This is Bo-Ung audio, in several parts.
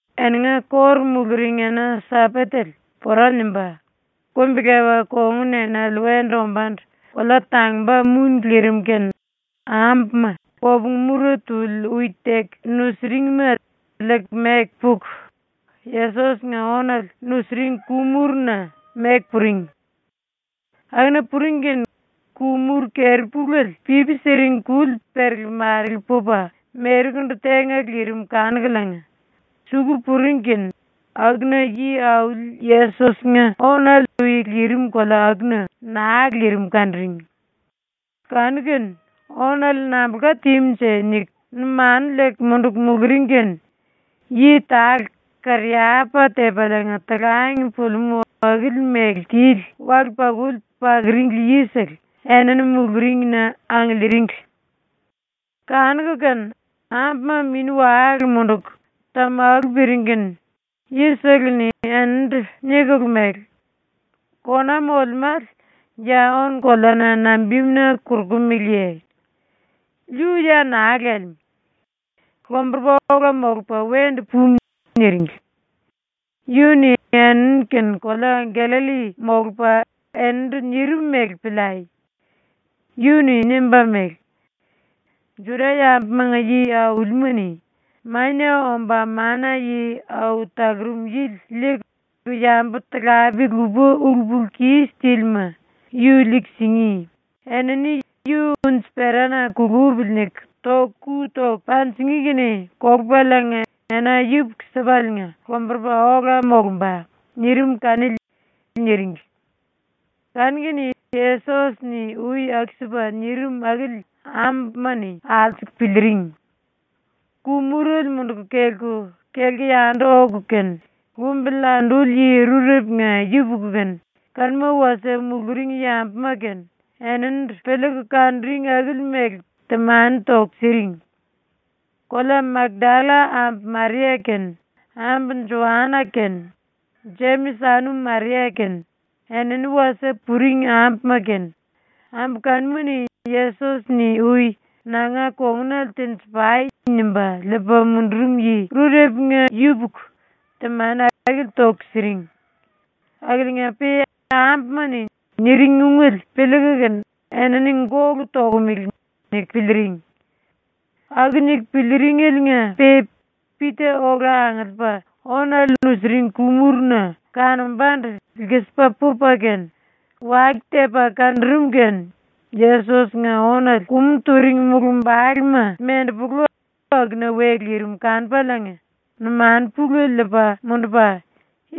⸤Eninga kóru muluring⸥ ena-Sambatele pora nimba, kumbi-lepa kongun enale wendu ombándu kolea tangumba muni lirim kene ambuma kopungu mura tuli ui teku nusuringma liiku meku puku, ⸤Yesos-nga⸥ ónale nusiring ku-muruna meku puring. Akuna puring kene ku-muru keri-puléle pipi siring kuli perele-marele pupa merekundu tenga lirim kanukuliinga, suku puring kene akuna Yi-Auli Yesos-nga ónale ui lirim kolea akuna naa lirim kanuring. Kanu-kene ‘Ónale nambulka tímunje?’ niku numanu liiku munduku muluring kene yi tale kariyapa tepaliinga talang pulimú akili mele tili wale-pakuli pakuringli yisele enini muluringna angiliiringli. Kanuku kene ambuma mini-wale munduku tamalu piring kene yisele-ni eninindu nikulu mele: “Kona molemále, ya ónu-koleana nambimuna korokumeleye? Yu ya naa lelemú. Lomburupa ola molupa wendu pumu.” ⸤niringli.⸥ “Yu-ni ⸤eni-kene⸥ kolea Gallalli molupa enindu nirim mele piliai. Yu-ni nimba mele: “⸤Juda-yambumanga yi-aulima-ni⸥ Mania Omba Mana-Yi Au Talurum Yili liiku yambu-talape lupa ulu-pulu-kis tílima yu liiku singí, enini ‘yu unji-perana kulupili’ niku ⸤toku⸥ ku toku panjingí kene kolupaliinga ena yupuku-sipaliinga lomburupa ola molumba.” nirim kanili.” niringli. Kanu-kene Yesos-ni ui aku-sipa nirim akili ambuma-ni alsuku piliiring. Ku-murele munduku kelku, kelku yandu oku kene, lumbili anduli yi rurepunga yupuku kene kanuma wasie muluring yambuma kene eninindu piliiku kanuring akili mele temani toku siring. Kolea Makdalla ambu Maria kene, ambu Joana kene, Jemis anum Maria kene, enini wasie puring ambuma kene, ambu kanuma-ni Yesos-ni ui “Nanga kongunale tenji-pai.” nimba liipa mundurum yi rurepunga yupuku temani akili toku siring. Akiliinga-pe ambuma-ni niring ungele piliiku kene ‘Enini gólu tokomele.’ niku piliiring. Aku niku piliiringeliinga-pe Pita ola angiliipa ónale nusiring ku-muruna kanombandu lkisipa pupa kene, wake tepa kanurum kene Yesos-nga ónale kumu turing mulumbalema mendepulu akuna we lirim kanupaliinga numanu pulele liipa mundupa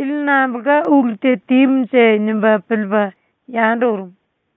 ‘Ili nambulka ulu te tímunje?’ nimba piliipa yandu urum.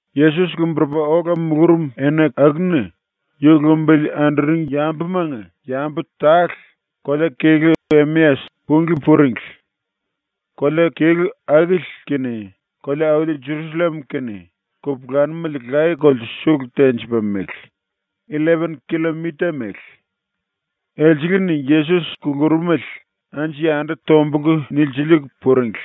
Yesos lomburupa ola mulurum ena akuna ⸤yu lumbili anduring yambumanga⸥ yambu tale kolea-kelú Emeas punglí puringli. Kolea-kelú akili kene kolea-auli Jerusallem kene kupulanumele laye-kolte sulu tenjipa mele, illepen killomita mele. Elsele-ni Yesos kulurumele anju-yandu tombulku nilsiliiku puringli.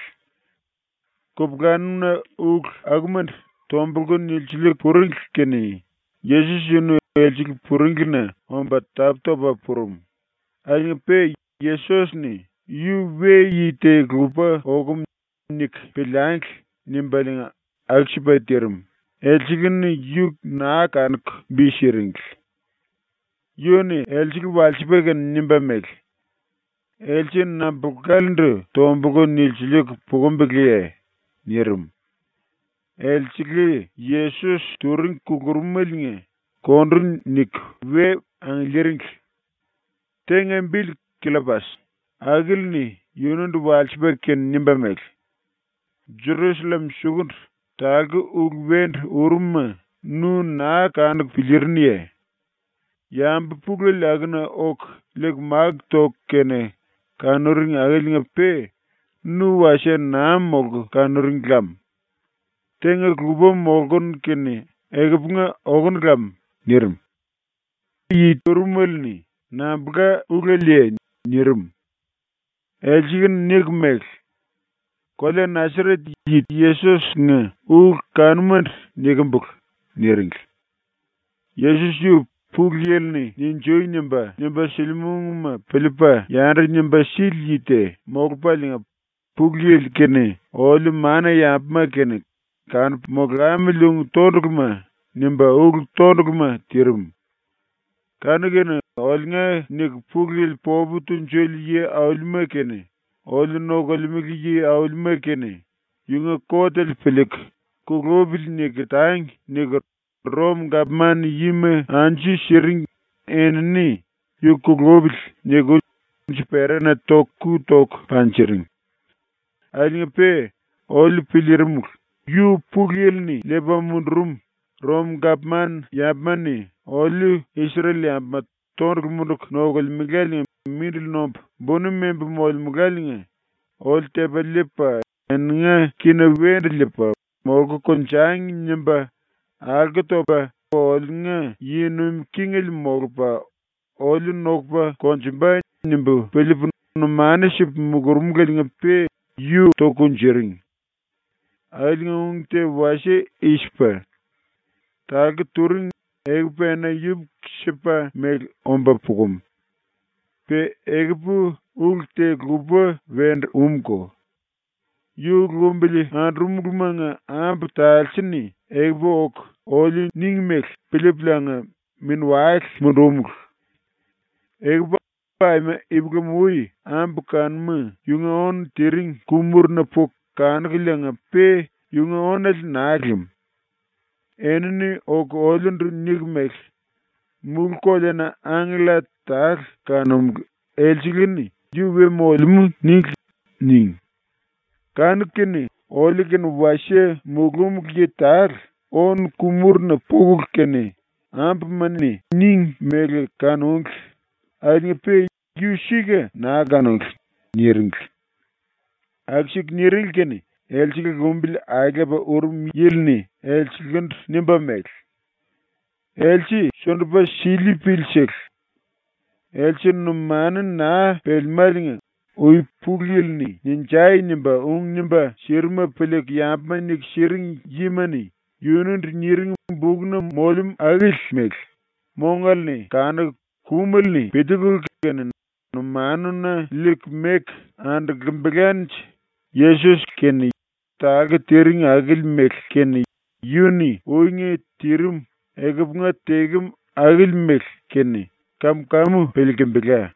Kupulanum-na ulu akumandu tombulku nilsiliiku puringli kene Yesos yunu elsele puringlina omba tapú-topa purum, akiliinga-pe Yesos-ni ‘Yu we-yi te-lupa okum niku piliangli.’ nimbaliinga aku-sipa tirim, elsele-ni yu naa kanuku bi siringli. Yu-ni elsele walsipa kene nimba mele: “Else nambulkalendu tombulku nilsiliikulu pukumbiliye?” nirim. Elsele Yesos turing kulurumeliinga kondu niku we angiliiringli. Tenga bili Killopas, akili-ni yunundu walsipa kene nimba mele: “Jerusallem sukundu talku ulu wendu urum-ma nu naa kanuku piliirinuye? Yambu pulele akuna oku liiku máku toku kene kanuring akiliinga-pe nu wasie naa molku kanuring lam. Tenga lupa molkunu kene ekupunga okonu lam.” nirim. Yi urumele-ni “Nambulka uleleye?” nirim. Elsele-ni nikulu mele: “Kolea Nasaret yi Yesos-nga ulu kanumandu nikimbulu.” niringli. “Yesos yu Pulu Yili-ni “Ninjui” nimba, nimba silimú ungma piliipa yandu nimba sili yi te molupaliinga Pulu Yili kene oliu mana-yambuma kene kanupu molamili ung tonduluma nimba ulu tonduluma tirim. Kanu-kene oliunga niku Pulu Yili popu tunjuli yi-aulima kene oliu nokolemele yi-aulima kene ‘Yunga kotele piliiku “Kulupili.” niku tangi.’ niku ⸤Rom-gapman yima⸥ anju siring enini ‘Yu kulupili.’ niku unji-perana ⸤toku⸥ ku toku panjiring. Akiliinga-pe oliu piliirimulu, ‘Yu Pulu Yili-ni liipa mundurum, ⸤Rom-gapman yambuma-ni oliu⸥ Isrel-yambuma ⸤tondulu munduku nokulemeláliinga⸥ mindili nombu buni membu molemuláliinga oliu tepa liipa ⸤eninga kína⸥ wendu liipa ‘Molku konjangi.’ nimba ⸤alko topa⸥ oliunga yi nuim kingele molupa oliu nokupa konjumba.’ nimbu piliipu numanu sipu mulurumuleliinga-pe yu toku kunjuring. Akiliinga ung te wasie i-sipa: Talku turing, ekupu ena yupuku-sipa mele omba pukum. “Pe ekupu ulu te lupa wendu úmko. Yu lumbili andurumulumanga ambu talse-ni ekupu oku oliu níngi mele piliipuliinga mini-wale mundúmulu. Ekupu aima ipulam-ui ambu kanuma yunga ónu tiring ku-muruna puku kanúngeliinga-pe yunga ónale naa lim. Enini oku oliundu niku mele: “Mulú-koleana angkella tale kanúmulu, elsele-ni “Yu we molemú.” níngli.” níngi. Kanu-kene oliu-kene wasie mulúmulu yi tale ónu ku-muruna pukulu kene ambuma-ni níngi mele kanúngli, akiliinga-pe yu sika naa kanúngli.” niringli. Aku-siku niringli kene elsele lumbili aelepa urum yili-ni elselendu nimba mele: “Else sundupa sili-pili-sele. Else numanu naa pelemáliinga ui Pulu Yili-ni “Ninjai!” nimba ung nimba sirimuma piliiku yambuma niku siring yima-ni yunundu niring bukna molemú akili mele, mongale-ni kanuku kumele-ni piliikulu kene numanuna liiku meku andulkimbilánje ⸤Yesos-kene talku tiring akili mele kene yunu-ni uinga tirim ekupunga tekem akili mele kene⸥ kam-kamu piliilkimbila.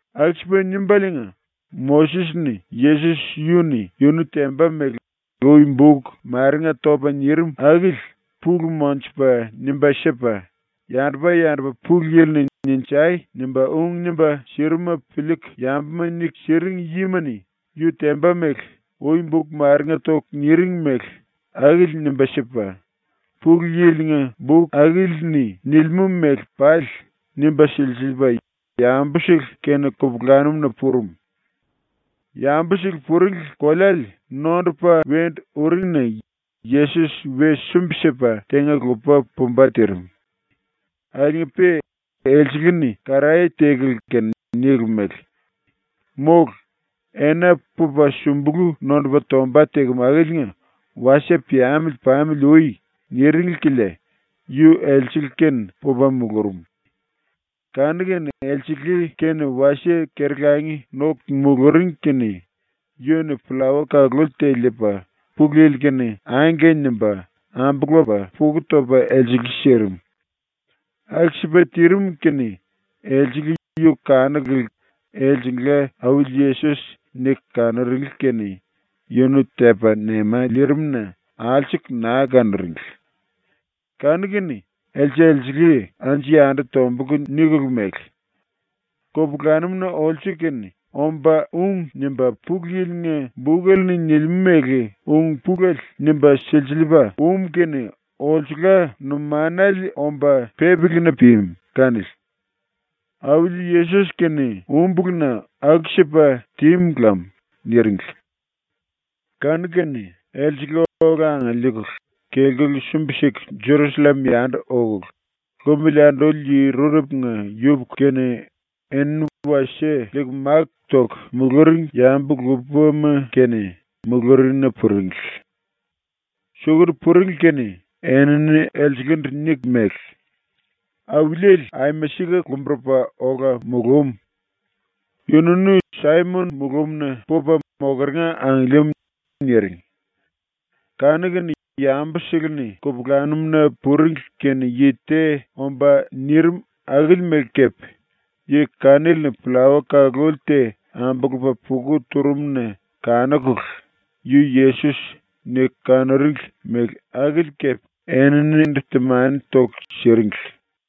Aku-sipa nimbaliinga Moses-ni Yesos yu-ni yunu temba mele ui buk marenga topa nirim akili pulu monjupa nimba sipa, yandupa-yandupa Pulu Yili-ni “Ninjai!” nimba ung nimba sirimuma piliiku yambuma niku siring yima-ni yu temba mele ui buk marenga toku niring mele akili nimba sipa, Pulu Yili-nga buk akili-ni nilimú mele pali nimba silsiliipa yambusele kene kupulanum-na purum. Yambusele puringli koleale nondupa wendu uring-na Yesos we sumbi-sipa tenga-lupa pumba tirim. Akiliinga-pe elsele-ni karaye tekulu kene nikulu mele: “Mólu. Ena pupa sumbulu nondupa tomba tekem akiliinga wasie piamili ⸤pamili ui⸥.” niringli kilia yu elsele-kene pupa mulurum. Kanu-kene elsele kene wasie keri-langi noku muluring kene yu-ni pllawa kaluli te liipa Pulu Yili-kene “Angke.” nimba, ambulupa puku topa elsele sirim. Aku-sipa tirim kene elsele yu kanukulu elsengla Auli Yesos niku kanuringli kene yunu tepa nema liirim-na alsuku naa kanuringli. Kanu-kene else-elsele anju-yandu tombulku nikulu mele: “Kupulanum-na olsu-kene omba ung nimba Pulu Yili-nga bukele-ni nilimú mele ung-pulele nimba silsiliipa um kene olsula numanale omba pípilina pimu kanili. Auli Yesos-kene úmbulu-na aku-sipa tímu lam.” niringli. Kanu-kene elsele ola angiliikulu kelkulu sumbi-siku Jerusallem yandu okulu, lumbili anduli yi rurepunga yupuku kene enini wasie liiku máku toku muluring yambu lupama kene muluringna puringli. Sukundu puringli kene enini elselendu niku mele: “Auliele aima sika lomburupa ola mulúm. Yununu Saimon mulumna pupa mokeringa angiliim.” niring. Kanu-kene yambusele-ni kupulanum-na puringli kene yi te omba nirim akili mele kepe yi kanili-ni pllawa kaluli te ambulupa puka turum-na kanukulu ‘Yu Yesos.’ niku kanuringli mele akili kepe eninindu temani toku siringli.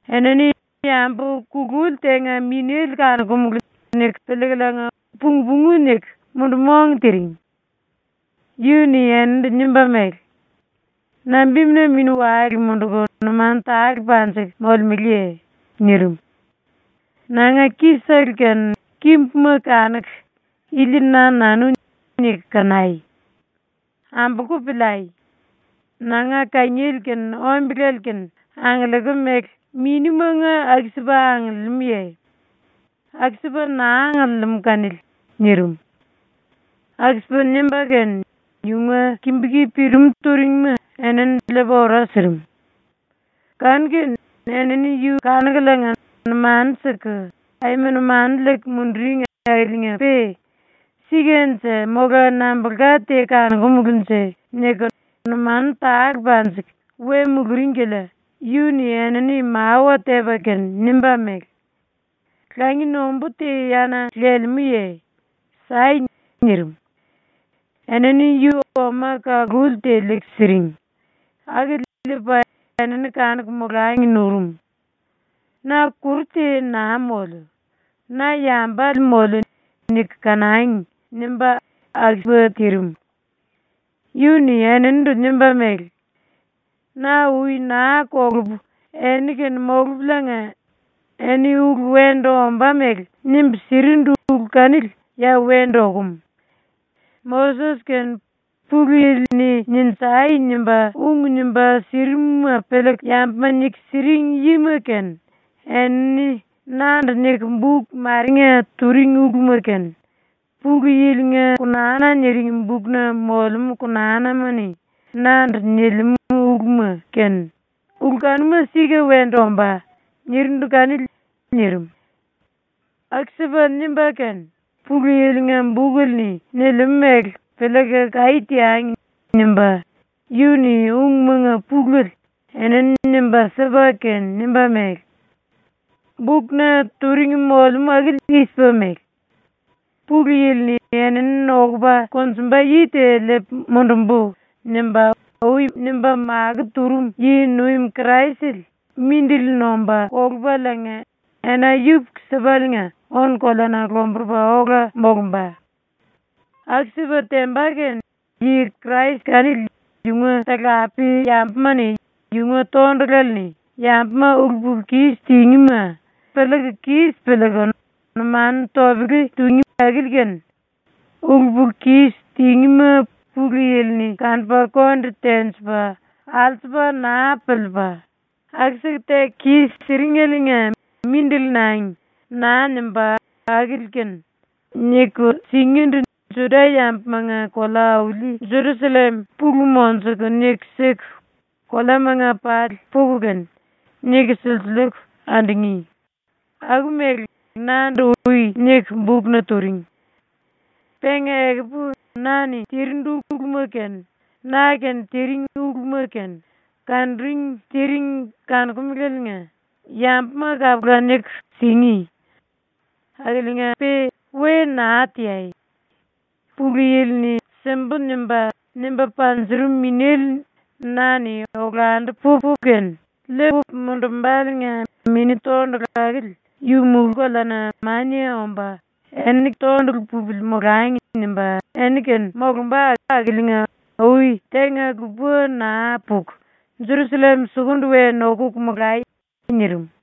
Enini ‘Yambu kululi tenga minéle kanokumulu.’ niku piliikuliinga pung-pungu niku mundu-mong tiring. Yu-ni eninindu nimba mele: “Nambimuna mini-wale munduku numanu tale panjiku molemeleye?” ⸤nirim.⸥ “Nanga ki-sele kene kimbuma kanuku ‘Ili na-nanu.’ niku kanai. Ambolku piliai. Nanga kangiele kene ombele kene angiliikim mele minimanga aku-sipa angiliimúye? ⸤Aku-sipa naa angiliimú kanili.⸥” nirim. Aku-sipa nimba kene yunga kimbu-ki pirimú turingima enini liipa ora sirim. Kanu-kene enini yu kanukuliinga numanu siku aima numanu liiku munduring akiliinga-pe ‘Sikanje mola nambulka te kanokumulunje?’ niku numanu tale panjiku we muluring kilia yu-ni enini mawa tepa kene nimba mele: “Langi nombú te yana lelemúye? ⸤Sai.⸥” nirim. Enini yu oma kaluli te liiku siring, akili liipa enini kanuku molangi nurum. ⸤‘Na kuru te naa moliu, na yambale moliu niku kanangi.’ nimba aku-sipa tirim.⸥ Yu-ni eninindu nimba mele: “Na ui naa kolupu eni-kene molupuliinga eni ulu wendu ombá mele nimbu sirindu ulu kanili ya wendu okum. “Moses kene Pulu Yili-ni “Ninjai!” nimba ung nimba sirimuma piliiku yambuma niku siring yima kene enini nandu niku buk marenga turing uluma kene, Pulu Yili-nga konana niring bukna molemú konanama-ni nandu nilimú uluma kene, ulu kanuma sika wendu ombá.” nirindu kanili.” nirim. Aku-sipa nimba kene ‘Pulu Yili-nga bukele-ni nilimú mele piliiku kaí teangi.’ nimba yu-ni ungmanga pulele enini nimba sipa kene nimba mele: “Bukna turing molemú akili i-sipa mele: ‘Pulu Yili-ni “Enini nokupa konjumba yi te liipu mundumbu.” nimba ui nimba makó turum yi-nuim Kraisele mindili nomba kolupaliinga ena yupuku-sipaliinga ónu-koleana lomburupa ola molumba. Aku-sipa temba kene yi Krais kanili yunga talape-yambuma-ni yunga tondulale-ni yambuma ulu-pulu-kis tingíma piliiku kis piliiku numanu topele tungí akili kene, ulu-pulu-kis tingíma Pulu Yili-ni kanupa konde tenjipa alsupa naa piliipa “Aku-siku teku kis-siringeliinga mindili nangi.” naa nimbá akili kene, niku singíndu Juda-yambumanga kolea-auli Jerusallem pulu monjuku niku siku koleamanga pali puku kene niku silsiliiku andungí.’, aku-mele nandu ui niku bukna turing. “Penga ekupu na-ni tirindu uluma kene na-kene tiring uluma kene kanuring tiring kanokumeleliinga yambuma kapula niku singí. Akiliinga-pe we naa teai. Pulu Yili-ni “Simbu.” nimba, nimba panjurum ⸤Minéle⸥ na-ni olandu pupu kene liipu mundumbáliinga ⸤Mini Tondulu akili yu⸥ mulú-koleana mania omba ‘Eni tondulu pupili molangi.’ nimba eni-kene molumba akiliinga ui tenga lupa naa puku Jerusallem sukundu we nokuku molai.” nirim.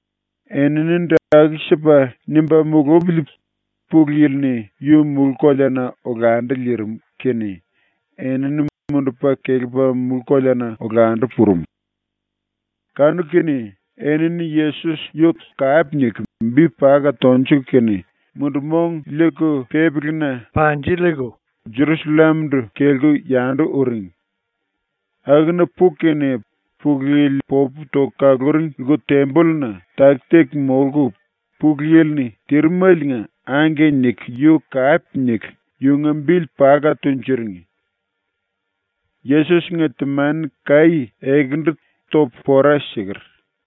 Eninindu aku-sipa nimba mulupili ⸤Pulu Yili-ni⸥ yu mulú-koleana olandu liirim kene enini mundupa kelepa mulú-koleana olandu purum. Kanu-kene enini ⸤Yesos⸥ yu kape niku bi paka tonjuku kene mundu-mong liiku pípili-na panjiliiku, Jerusallem-ndu kelku yandu uring. Akuna puku kene ⸤Pulu Yili popu toku kaluring⸥ lku-tembolluna taki-taki molku, Pulu Yili-ni tirimeliinga “Angke” niku yu kape niku yunga bili paka tunjuring. ⸤Yesos-nga temani kaí ekendu topu pora siker.⸥